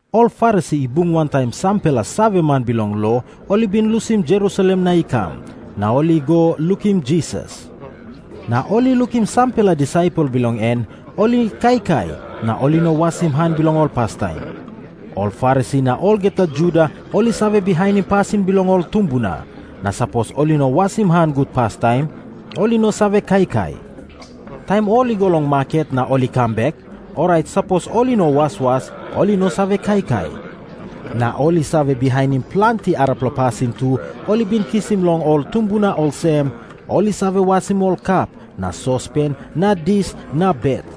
Ol Farisi i bung wantaim sampela saveman bilong lo ol i bin lusim Jerusalem na i kam, na ol i go lukim Jisas. Na ol i lukim sampela disaipel bilong en ol i kaikai, na ol i no wasim han bilong ol pastaim. Ol Farisi na olgeta Juda ol i save bihainim pasin bilong ol tumbuna, na sapos ol i no wasim han gut pastaim, ol i no save kaikai. Taim ol i go long maket na ol i kam bek, orait sapos ol i no waswas, ol i no save kaikai. Na ol i save bihainim planti arapela pasin tu ol i bin kisim long ol tumbuna olsem, ol i save wasim ol kap na sospen na dis na bet.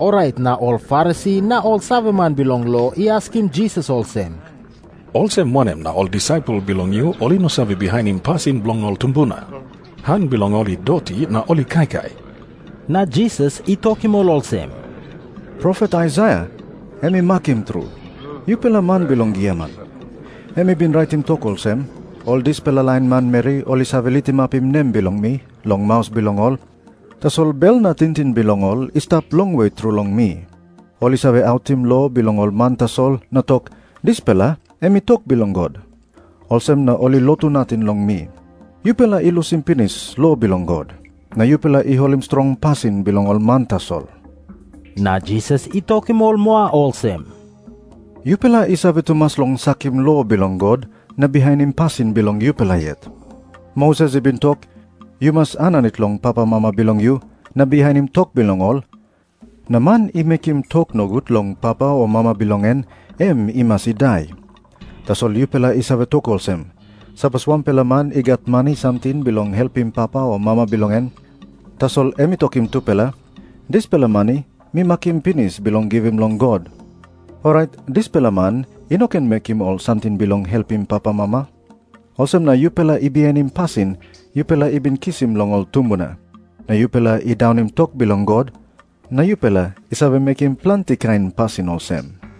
Orait na ol Farisi na ol saveman bilong lo i askim Jisas olsem, "Olsem wanem na ol disaipel bilong yu ol i no save bihainim pasin bilong ol tumbuna? Han bilong ol i doti na ol I kaikai." Na Jisas i tokim ol olsem, "Profet Aisaia em i makim tru yupela man bilong giaman. Em i bin raitim tok olsem, 'Ol dispela lain manmeri ol i save litimapim nem bilong mi long maus bilong ol, tasol bel na tingting bilong ol i stap longwe tru long mi. Ol i save autim lo bilong ol man tasol na tok, "Dispela em i tok bilong God." Olsem na ol i lotu nating long mi.' Yupela i lusim pinis lo bilong God, na yupela i holim strong pasin bilong ol man tasol." Na Jisas i tokim ol moa olsem, "Yupela i save tumas long sakim lo bilong God na bihainim pasin bilong yupela yet. Moses i bin tok, 'Yu mas aninit long papamama bilong yu na bihainim tok bilong ol,' na 'Man i mekim tok nogut long papa o mama bilong en, em i mas i dai.' Tasol yupela i save tok olsem, 'Sapos wanpela man i gat mani samting bilong helpim papa o mama bilong en, tasol em i tokim tupela, "Dispela mani mi makim pinis bilong givim long God," orait dispela man i no ken mekim ol samting bilong helpim papamama.' Olsem na yupela i bihainim pasin yupela i bin kisim long ol tumbuna, na yupela i daunim tok bilong God. Na yupela i save mekim planti kain pasin olsem."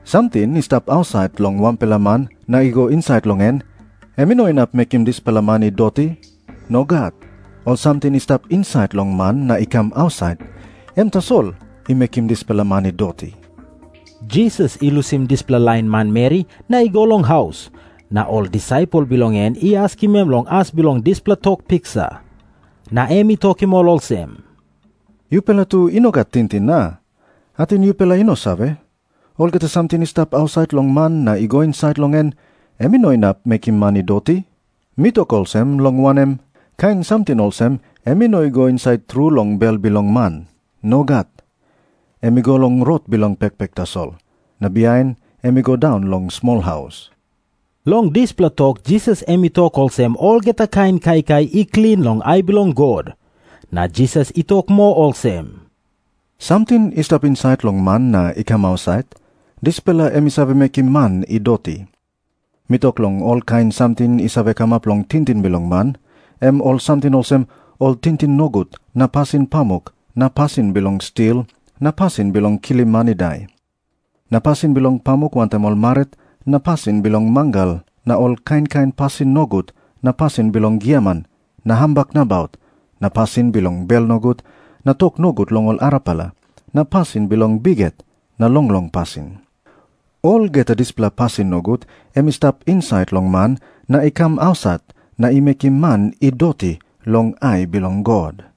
Samting i stap ausait long wanpela man na i go insait long en, em i no inap mekim dispela man i doti. Nogat. Ol samting i stap insait long man na i kam ausait, em tasol i mekim dispela man i doti." Jisas i lusim dispela lain manmeri na i go long haus. Na ol disaipel bilong en i askim em long as bilong dispela tok piksa. Na em i tokim ol olsem, "Yupela tu i no gat tingting, a? Ating yupela i no save, olgeta samting i stap ausait long man na i go insait long en, em i no inap mekim man i doti? Mi tok olsem, long wanem, kain samting olsem em i no i go insait tru long bel bilong man. Nogat. Em i go long rot bilong pekpek tasol, na bihain em i go daun long smolhaus." Long dispela tok Jisas em i tok olsem olgeta kain kaikai i klin long ai bilong God. Na Jisas i tok moa olsem, "Samting i stap insait long man na i kam ausait, dispela em i save mekim man i doti. Mi tok long olkain samting i save kamap long tingting bilong man, em ol samting olsem, ol tingting nogut na pasin pamuk na pasin bilong stil na pasin bilong kilim man i dai na pasin bilong pamuk wantaim ol marit na pasin bilong mangal na ol kain kain pasin nogut na pasin bilong giaman na hambak nabaut na pasin bilong bel nogut na tok nogut long ol arapela na pasin bilong bikhet na longlong pasin. Olgeta dispela pasin nogut em i stap insait long man na i kam ausait na i mekim man i doti long ai bilong God."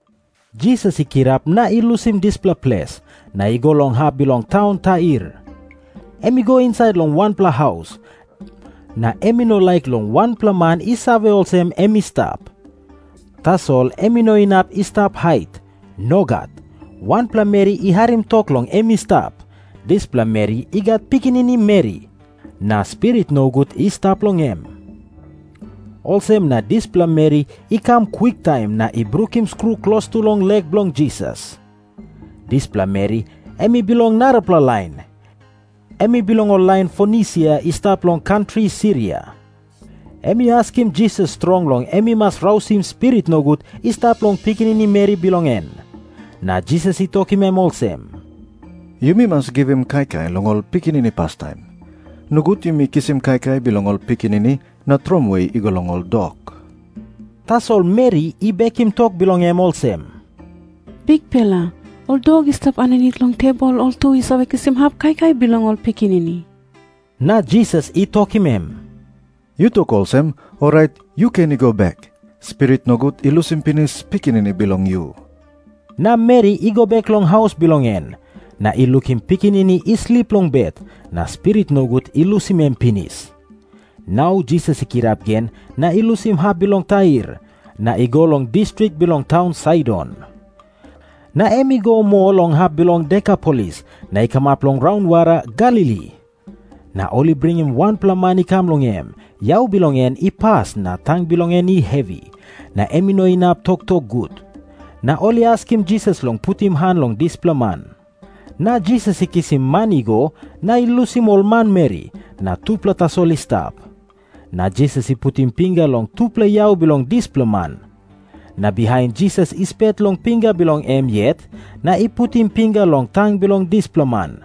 Jisas i kirap na i lusim dispela ples, na i go long hap bilong taun Tair. Em i go insait long wanpela haus, na em i no laik long wanpela man i save olsem em i stap. Tasol em i no inap i stap hait. Nogat. Wanpela meri i harim tok long em i stap. Dispela meri i gat pikinini meri, na spirit nogut i stap long em. Olsem na dispela meri i kam kwiktaim na i brukim skru klostu long lek bilong Jisas. Dispela meri em i bilong narapela lain. Em i bilong ol lain Fonisia i stap long kantri Siria. Em i askim Jisas strong long em i mas rausim spirit nogut i stap long pikinini meri bilong en. Na Jisas i tokim em olsem, "Yumi mas givim kaikai long ol pikinini pastaim. Nogut yumi kisim kaikai bilong ol pikinini na tromoi i go long ol dok." Tasol meri i bekim tok bilong em olsem, "Bikpela, ol dok i stap aninit long tebol ol tu i save kisim hap kaikai bilong ol pikinini." Na Jisas i tokim em, "Yu tok olsem, orait yu ken i go bek. Spirit nogut i lusim pinis pikinini bilong yu." Na meri i go bek long haus bilong en, na i lukim pikinini i slip long bet, na spirit nogut i lusim em pinis. Nau Jisas i kirap gen na i lusim hap bilong Tair, na i go long distrik bilong taun Saidon. Na em i go moa long hap bilong Dekapolis, na i kamap long raunwara Galili. Na ol i bringim wanpela man i kam long em, yau bilong en i pas na tang bilong en i hevi, na em i no inap toktok gut. Na ol i askim Jisas long putim han long dispela man. Na Jisas i kisim man i go, na i lusim ol manmeri, na tupela tasol i stap. Na Jisas i putim pinga long tupela yau bilong dispela man. Na bihain Jisas i spet long pinga bilong em yet, na i putim pinga long tang bilong dispela man.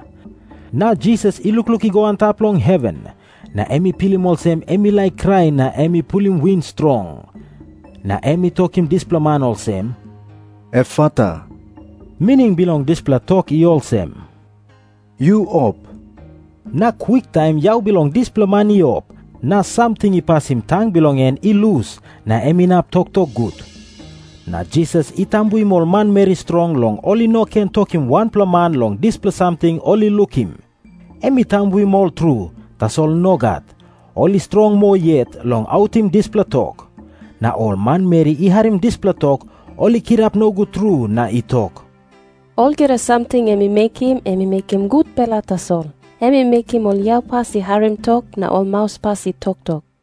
Na Jisas i lukluk i go antap long heven, na em i pilim olsem em i laik krai na em i pulim win strong. Na em i tokim dispela man olsem, "Efata." Mining bilong dispela tok i olsem, "Yu op." Na kwiktaim yau bilong dispela man i op, na samting i pasim tang bilong en i lus na em inap toktok gut. Na Jisas i tambuim ol manmeri strong long ol i no ken tokim wanpela man long dispela samting ol i lukim. Em i tambuim ol tru, tasol nogat, ol i strong moa yet long autim dispela tok. Na ol manmeri i harim dispela tok, ol i kirap nogut tru na i tok, "Olgeta samting em i mekim, em i mekim gutpela tasol. Em i mekim ol yaupas i harim tok, na ol mauspas i toktok."